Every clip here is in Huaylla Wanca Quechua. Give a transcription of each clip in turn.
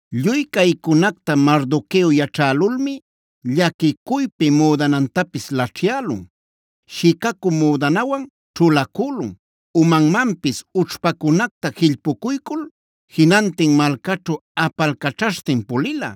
Lluy caycunacta Mardoqueo yaćhälulmi llaquicuypi müdanantapis laćhyälun, shicacü müdanawan ćhulacülun, umanmanpis ućhpacunacta jillpucuycul jinantin malcaćhu apalcaćhaśhtin pulila.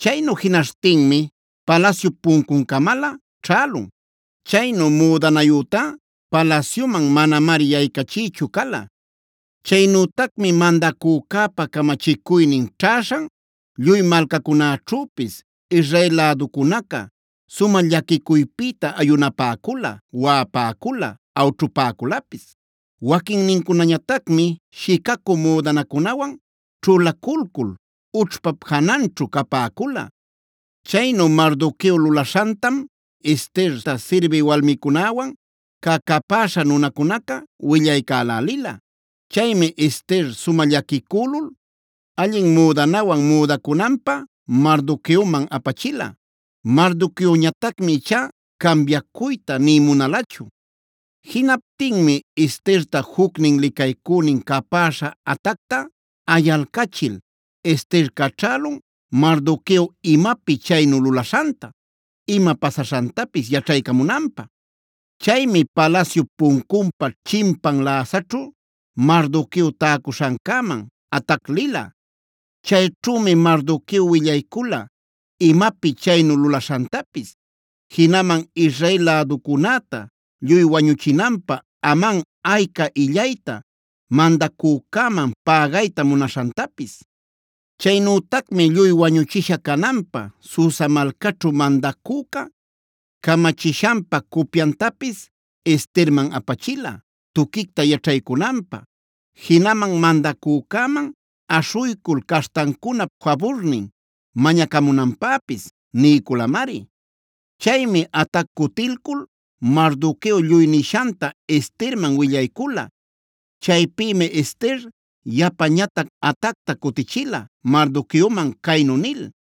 Chaynu jinaśhtinmi palasyup puncuncamalä ćhälun. Chaynu müdanayütá palasyuman manamari yaycachiychu cala. Chaynütacmi mandacücäpa camachicuynin ćhäśhan lluy malcacunäćhüpis Israel läducunaca sumä llaquicuypïta ayunapäcula, waꞌapäcula, awćhupäculapis. Waquinnincunañatacmi shicacü müdanacunawan ćhulaculcul ućhpa jananćhu capäcula. Chaynu Mardoqueo lulaśhantam Esterta sirbï walmicunäwan cä capäśha nunacunaca willaycälälila. Chaymi Ester sumä llaquicülul allin müdanawan müdacunanpä Mardoqueoman apachila. Mardoqueoñatacmi ichá cambiacuyta nï munalachu. Jinaptinmi Esterta jucnin licaycünin capäśha Hatacta ayalcachil, Ester caćhälun Mardoqueo imapi chaynu lulaśhanta, ima pasaśhantapis yaćhaycamunanpä. Chaymi palasyup puncunpa chimpan läsaćhu Mardoqueo täcuśhancäman Hatac lila. Chayćhümi Mardoqueo willaycula imapi chaynu lulaśhantapis, jinaman Israel läducunäta lluy wañuchinanpä Aman ayca illayta mandacücäman pägayta munaśhantapis. Chaynütacmi lluy wañuchisha cananpä Susa malcaćhu mandacüca camachishanpa cupyantapis Esterman apachila, tuquicta yaćhaycunanpä. Jinaman mandacücäman aśhuycul caśhtancunap faburnin mañacamunanpäpis niyculamari. Chaymi Hatac cutilcul Mardoqueo lluy nishanta Esterman willaycula. Chaypïmi Ester yapañatac Hatacta cutichila Mardoqueoman caynu nil: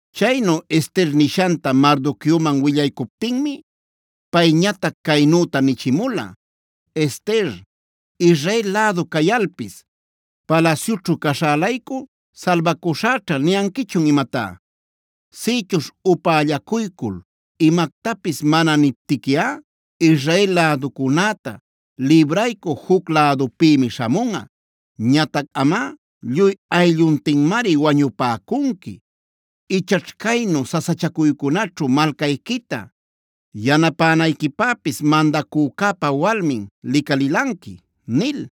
Chaynu Ester nishanta Mardoqueoman willaycuptinmi, payñatac caynüta nichimula: “Ester, ¿Israel lädu cayalpis, ‘palasyućhu caśhä-laycu salbacüśhäćha’ niyanquichun imatá? Sïchuśh upällacuycul imactapis mana niptiquiꞌa, Israel läducunäta libraycü juc lädupïmi śhamunꞌa. Ñatac amꞌa lluy aylluntinmari wañupäcunqui. Ichaćh caynu sasachacuycunaćhu malcayquita yanapänayquipäpis mandacücäpa walmin licalilanqui” nil.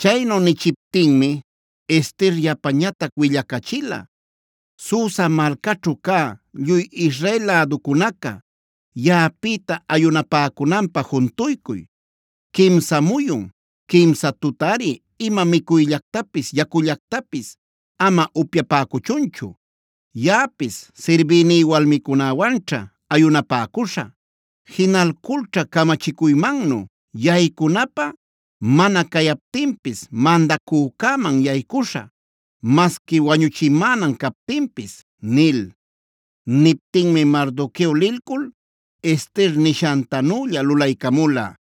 Chaynu nichiptinmi Ester yapañatac willacachila: “Susa malcaćhu cä lluy Israel läducunaca yaꞌapïta ayunapäcunanpä juntuycuy. Quimsa muyun, quimsa tutari ima micuyllactapis yacullactapis ama upyapäcuchunchu. Yaꞌapis sirbïní walmicunäwanćha ayunapäcuśhä. Jinalculćha camachicuymannu yaycunapä mana cayaptinpis mandacücäman yaycuśhä masqui wañüchimänan captinpis” nil. Niptinmi Mardoqueo lilcul Ester nishantanülla lulaycamula.